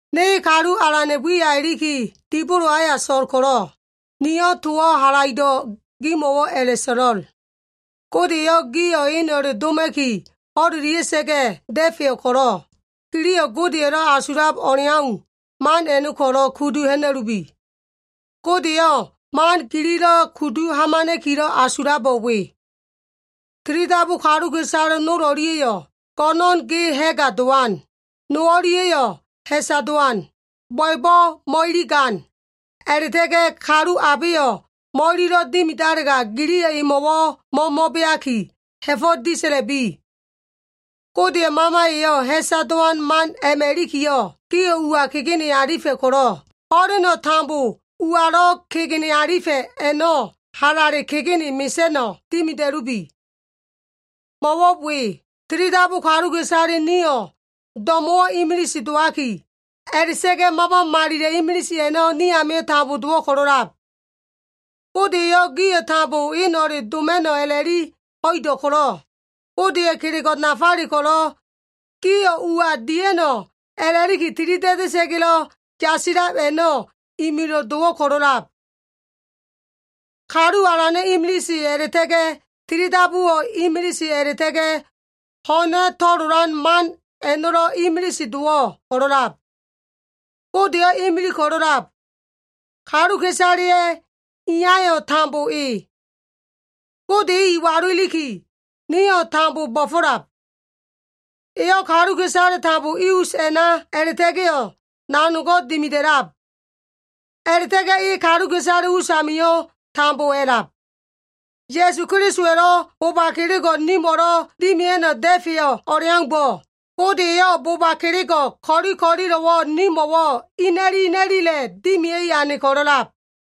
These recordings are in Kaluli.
Ne Kalu Alana꞉ wiya iliki dibolo aya so꞉l ko꞉lo꞉, niyo꞉ towo꞉ halaido꞉ gimo꞉wo꞉ a꞉la꞉so꞉lo꞉l. Gode eyo꞉ gio꞉ eno꞉le doma꞉ki ho꞉lelia꞉sa꞉ga꞉ da꞉feyo꞉ ko꞉lo꞉, giliyo꞉ Godeya꞉lo꞉ asulab o꞉leau, man a꞉no꞉ ko꞉lo꞉ kudu ha꞉na꞉lubi. Gode eyo꞉ man gililo꞉ kudu hamana꞉kilo꞉ asulabo꞉ we. Tilidabu kaluka꞉isale no o꞉lia꞉yo꞉, go꞉no꞉n ge ha꞉ga dowan, no o꞉lia꞉yo꞉ ha꞉sa dowan, bo꞉ebo꞉ mo꞉iligan, a꞉la꞉ta꞉ga꞉ kalu abeyo꞉ mo꞉ililo꞉ dimidalega giliyo꞉ emo꞉wo꞉ mo꞉mo꞉beaki, ha꞉fo꞉ disa꞉la꞉bi. Godeya꞉ Mama eyo꞉ ha꞉sa dowan man a꞉ma꞉ ilikiyo꞉, gio꞉ uwa kegene alifa꞉ ko꞉lo꞉, ho꞉leno꞉ tambo uwalo꞉ kegene alifa꞉ a꞉no꞉ halale kegene mesa꞉no꞉ dimida꞉lubi. Mo꞉wo꞉ we, tilidabu kaluka꞉isale nio꞉ do꞉mo꞉wo꞉ imilise dowaki, a꞉la꞉ta꞉ga꞉ Mama malilo꞉ imilise a꞉no꞉ ni amio꞉ tambo dowo꞉ ko꞉lo꞉lab. Gode eyo꞉ gio꞉ tambo eno꞉le doma꞉no꞉ a꞉la꞉li ho꞉ido꞉ ko꞉lo꞉, Godeya꞉ kelego꞉ nafale ko꞉lo꞉ gio꞉ uwa dia꞉no꞉ a꞉la꞉liki tilida꞉da꞉sa꞉ga꞉lo꞉ yasilab a꞉no꞉ imilo꞉ dowo꞉ ko꞉lo꞉lab. Kalu Alano꞉ imilise, a꞉la꞉ta꞉ga꞉ tilidabuwo꞉ imilise, a꞉la꞉ta꞉ga꞉ ho꞉na to꞉lolan man a꞉no꞉lo꞉ imilise dowo꞉ ko꞉lo꞉lab. Godeyo꞉ imilig ko꞉lo꞉lab. Kaluka꞉isaleya꞉ Iyayo꞉ tambo e. Gode e iwalu iliki, nio꞉ tambo bo꞉fo꞉lab. Eyo꞉ kaluka꞉isale tambo i us a꞉na a꞉la꞉ta꞉ga꞉yo꞉ nanogo꞉ dimida꞉lab. A꞉la꞉ta꞉ga꞉ e kaluka꞉isale usamio꞉ tambo a꞉lab. Ya꞉su Kelisowa꞉lo꞉ boba kelego꞉ nimo꞉lo꞉ dimia꞉no꞉ da꞉feyo꞉ o꞉leaumbo꞉, Gode eyo꞉ bo꞉ba kelego꞉ ko꞉li ko꞉lilo꞉wo꞉ nimo꞉wo꞉ ina꞉li ina꞉lile dimia꞉i ane ko꞉lo꞉lab.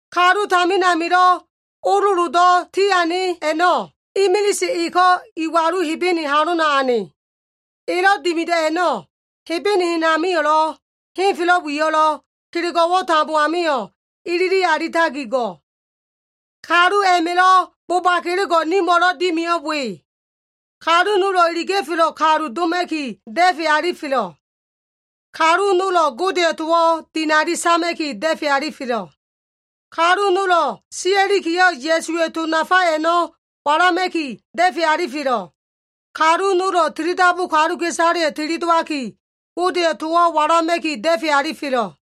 Kalu tamin amilo꞉ ololodo꞉ tiane a꞉no꞉, imilise eko꞉ iwalu Hebene halona ane. Elo꞉ dimido꞉ a꞉no꞉, Hebene hen amio꞉lo꞉ henfelo꞉ wiyo꞉lo꞉, kelego꞉wo꞉ tambo amio꞉ ilili alitaki go꞉. Kalu a꞉ma꞉lo꞉ boba kelego꞉ nimo꞉lo꞉ dimiyo꞉ we. Kalu nolo꞉ iliga꞉felo꞉ kalu doma꞉ki da꞉fe alifelo꞉. Kalu nolo꞉ Godeya꞉ towo꞉ dinali sama꞉ki da꞉fe alifelo꞉. Kalu nolo꞉ sia꞉likiyo꞉ Ya꞉suwa꞉ to nafa a꞉no꞉ walama꞉ki da꞉fe alifelo꞉. Kalu nolo꞉ tilidabu kaluka꞉isaleyo꞉ tili dowaki, Godeya꞉ towo꞉ walama꞉ki da꞉fe alifelo꞉.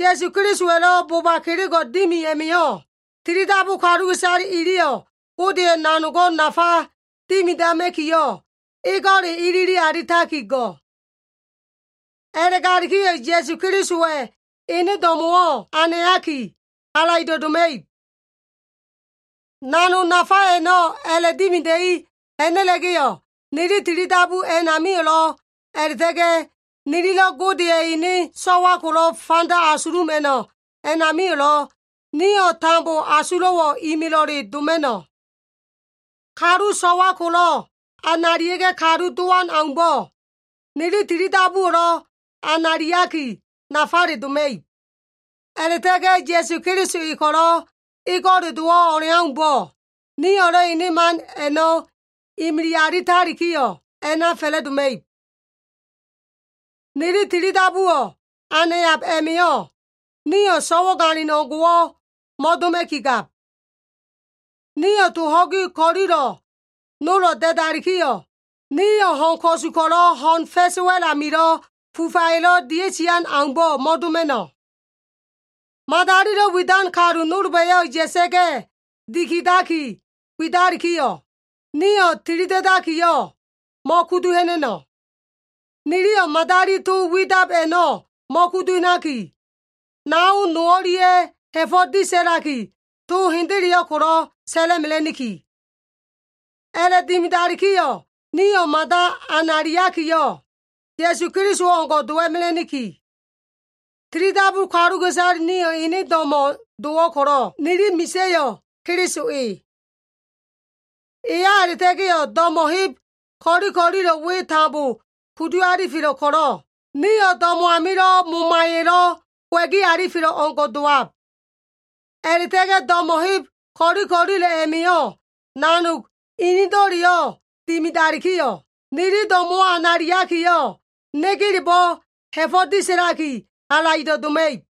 Ya꞉su Kelisowa꞉lo꞉ boba kelego꞉ dimi a꞉ma꞉yo꞉, tilidabu kaluka꞉isale iliyo꞉ Godeya꞉ nanogo꞉ nafa dimidama꞉kiyo꞉ ego꞉le ilili alitaki go꞉. A꞉la꞉galikiyo꞉ Ya꞉su Kelisowa꞉ ene do꞉mo꞉wo꞉ anayaki, halaido꞉ doma꞉ib. Nanog nafa a꞉no꞉ a꞉la꞉dimida꞉i ha꞉na꞉la꞉ga꞉yo꞉, nili tilidabu a꞉namio꞉lo꞉, a꞉la꞉ta꞉ga꞉ nililo꞉ Godeya꞉ ene so꞉wa ko꞉lo꞉ fanda asuluma꞉no꞉ a꞉namio꞉lo꞉, nio꞉ tambo asulo꞉wo꞉ imilo꞉le doma꞉no꞉. Kalu so꞉wa ko꞉lo꞉ analia꞉ga꞉ kalu dowan aumbo꞉, nili tilidabuwo꞉lo꞉ anayaki nafale doma꞉ib. A꞉la꞉ta꞉ga꞉ Ya꞉su Keliso e ko꞉lo꞉ ego꞉le dowo꞉ o꞉leaumbo꞉, nio꞉lo꞉ ene man a꞉no꞉ imili alitalikiyo꞉ a꞉na fa꞉la꞉doma꞉ib. Nili tilidabuwo꞉ anayab a꞉ma꞉yo꞉, nio꞉ so꞉wagalin o꞉ngo꞉wo꞉ mo꞉doma꞉ki gab. Nio꞉ to ho꞉gi ko꞉lilo꞉ nolo꞉ da꞉dalikiyo꞉, nio꞉ ho꞉n ko꞉su ko꞉lo꞉ ho꞉n fa꞉sa꞉ wa꞉l amilo꞉ fufaya꞉lo꞉ dia꞉sian aumbo꞉ mo꞉doma꞉no꞉. Madalilo꞉ widan kalu nolba꞉yo꞉ ya꞉sa꞉ga꞉ dikidaki widalikiyo꞉, nio꞉ tilida꞉dakiyo꞉ mo꞉kudu ha꞉na꞉no꞉. Niliyo꞉ madali to widab a꞉no꞉ mo꞉kuduha꞉naki, nao no o꞉lia꞉yo꞉ ha꞉fo꞉ disa꞉laki to hendeleyo꞉ ko꞉lo꞉ sa꞉la꞉mela꞉niki. A꞉la꞉dimidalikiyo꞉ nio꞉ mada analiakiyo꞉, Ya꞉su Keliso o꞉ngo꞉ dowa꞉mela꞉niki. Tilidabu kaluka꞉isale nio꞉ ene do꞉mo꞉ dowo꞉ ko꞉lo꞉, nili misa꞉yo꞉ Keliso e. Eya a꞉la꞉ta꞉ga꞉yo꞉ do꞉mo꞉ heb ko꞉li ko꞉lilo꞉ we tambo kudu alifelo꞉ ko꞉lo꞉, nio꞉ do꞉mo꞉ amilo꞉ momaya꞉lo꞉ kowa꞉gi alifelo꞉ o꞉ngo꞉ dowab. A꞉la꞉ta꞉ga꞉ do꞉mo꞉ heb ko꞉li ko꞉lilo꞉ a꞉ma꞉yo꞉ nanog inido꞉leyo꞉ dimidalikiyo꞉, nili do꞉mo꞉wo꞉ analiakiyo꞉, negelebo꞉ ha꞉fo꞉ disa꞉laki halaido꞉ doma꞉ib.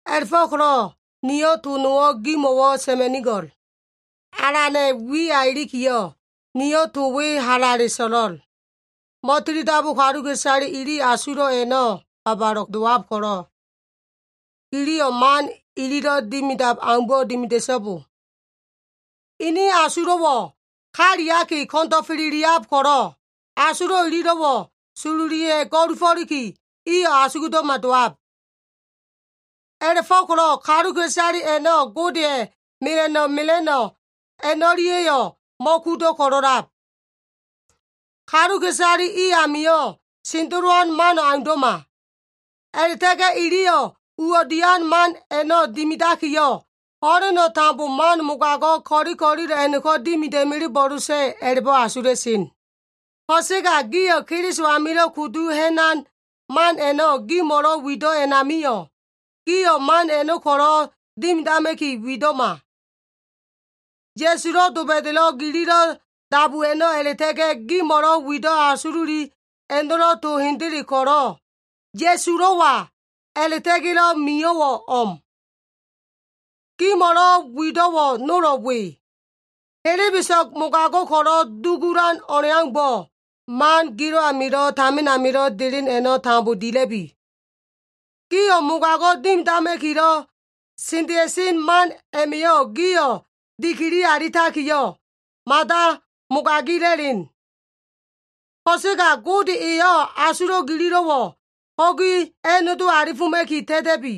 A꞉la꞉fo꞉ko꞉lo꞉ niyo꞉ to nowo꞉ gimo꞉wo꞉ sa꞉ma꞉nigo꞉l. Alana꞉ wiya ilikiyo꞉, niyo꞉ to we halale so꞉lo꞉l. Mo꞉tilidabu kaluka꞉isale ili asulo꞉ a꞉no꞉ babale dowab ko꞉lo꞉, giliyo꞉ man ililo꞉ dimidab aumbo꞉ dimida꞉so꞉bo. Ini asulo꞉wo꞉ kaliaki ko꞉ndo꞉feleliab ko꞉lo꞉, asulo꞉ ililo꞉wo꞉ sololiya꞉ go꞉lufo꞉liki, iyo꞉ asugdo꞉ma dowab. A꞉la꞉fo꞉ko꞉lo꞉ kaluka꞉isale a꞉no꞉ Godeya꞉ mela꞉no꞉ mela꞉no꞉ a꞉no꞉lia꞉yo꞉ mo꞉kudo꞉ ko꞉lo꞉lab. Kaluka꞉isale i amio꞉ sendelowan mano꞉ aundo꞉ma. A꞉la꞉ta꞉ga꞉ iliyo꞉ uwo꞉ dian man a꞉no꞉ dimidakiyo꞉, ho꞉leno꞉ tambo man mogago꞉ ko꞉li ko꞉lilo꞉ a꞉no꞉ko꞉ dimida꞉melebo꞉losa꞉ a꞉la꞉bo꞉ asula꞉sen. Ko꞉sega gio꞉ Keliso amilo꞉ kudu ha꞉nan man a꞉no꞉ gimo꞉lo꞉ wido꞉ a꞉namio꞉, gio꞉ man a꞉no꞉ ko꞉lo꞉ dimidama꞉ki wido꞉ma. Ya꞉sulo꞉ doba꞉da꞉lo꞉ gililo꞉ dabu a꞉no꞉ a꞉la꞉ta꞉ga꞉, gimo꞉lo꞉ wido꞉ asululi a꞉no꞉lo꞉ to hendele ko꞉lo꞉, Ya꞉sulo꞉wa a꞉la꞉ta꞉ga꞉lo꞉ mio꞉wo꞉ o꞉m. Gimo꞉lo꞉ wido꞉wo꞉ nolo꞉ we. Helebeso꞉g mogago꞉ ko꞉lo꞉ dugulan o꞉leaumbo꞉, man gilo꞉ amilo꞉ tamin amilo꞉ delen a꞉no꞉ tambo dila꞉bi. Gio꞉ mogago꞉ dimidama꞉kilo꞉ sendea꞉sen man a꞉ma꞉yo꞉ gio꞉ dikili alitakiyo꞉, mada mogagila꞉len. Ko꞉sega Gode eyo꞉ asulo꞉ gililo꞉wo꞉ ho꞉gi a꞉nodo alifoma꞉ki ta꞉ta꞉bi.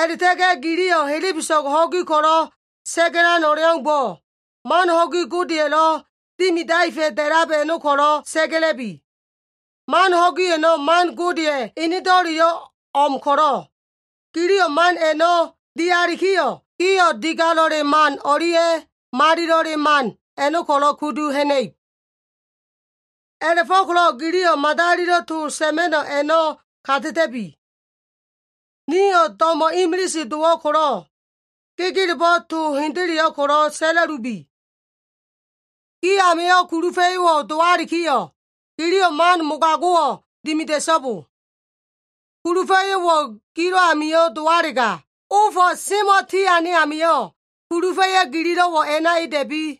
A꞉la꞉ta꞉ga꞉ giliyo꞉ helebeso꞉g ho꞉gi ko꞉lo꞉ sa꞉ga꞉lan o꞉leaumbo꞉, man ho꞉gi Godeya꞉lo꞉ dimidaefa꞉ da꞉lab a꞉no꞉ ko꞉lo꞉ sa꞉ga꞉la꞉bi. Man ho꞉gi a꞉no꞉ man Godeya꞉ enedo꞉leyo꞉ o꞉m ko꞉lo꞉, giliyo꞉ man a꞉no꞉ dialikiyo꞉, gio꞉ digalo꞉le man o꞉lia꞉, malilo꞉le man a꞉no꞉ ko꞉lo꞉ kudu ha꞉na꞉ib. A꞉la꞉fo꞉ko꞉lo꞉ giliyo꞉ madalilo꞉ to sa꞉ma꞉no꞉ a꞉no꞉ ka ta꞉ta꞉bi. Nio꞉ do꞉mo꞉ imilise dowo꞉ ko꞉lo꞉, gegelebo꞉ to hendeleyo꞉ ko꞉lo꞉ sa꞉la꞉lubi. Gi amio꞉ kulufa꞉yo꞉wo꞉ dowalikiyo꞉, giliyo꞉ man mogago꞉wo꞉ dimida꞉so꞉bo. Kulufa꞉yo꞉wo꞉ gilo꞉ amio꞉ dowalega, ofo꞉ semo꞉ tiane amio꞉, kulufa꞉yo꞉ gilo꞉wo꞉ a꞉na eda꞉bi.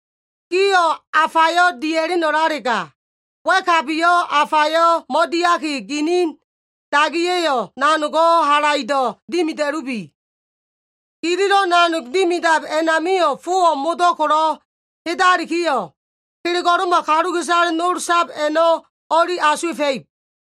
Gio꞉ afayo꞉ dia꞉lenolalega, wa꞉kabiyo꞉ afayo꞉ mo꞉diaki ginin dagiya꞉yo꞉ nanogo꞉ halaido꞉ dimida꞉lubi. Gililo꞉ nanog dimidab a꞉namio꞉ fowo꞉ modo꞉ ko꞉lo꞉ hedalikiyo꞉, kelego꞉lo꞉ma kaluka꞉isale nol sab a꞉no꞉ o꞉li asuwa꞉fa꞉ib.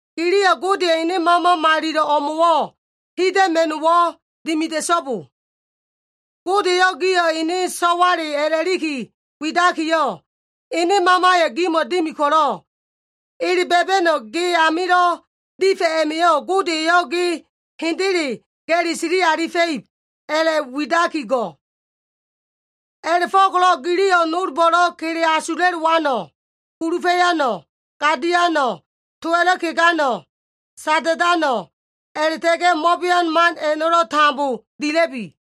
Giliyo꞉ Godeya꞉ ene Mama malilo꞉ o꞉mo꞉wo꞉ hida꞉ma꞉no꞉wo꞉ dimida꞉so꞉bo. Gode eyo꞉ gio꞉ ene so꞉wale a꞉la꞉liki widakiyo꞉, ene Mamayo꞉ gimo꞉ dimi ko꞉lo꞉, ele ba꞉ba꞉no꞉ ge amilo꞉ difa꞉ a꞉ma꞉yo꞉ Gode eyo꞉ ge hendele ga꞉li sili alifa꞉ib a꞉la꞉widaki go꞉. A꞉la꞉fo꞉ko꞉lo꞉ giliyo꞉ nolbo꞉lo꞉ kele asula꞉lowano꞉, kulufa꞉yano꞉, gadiano꞉, towa꞉lo꞉ kegano꞉, sada꞉dano꞉, a꞉la꞉ta꞉ga꞉ mo꞉bean man a꞉no꞉lo꞉ tambo dila꞉bi.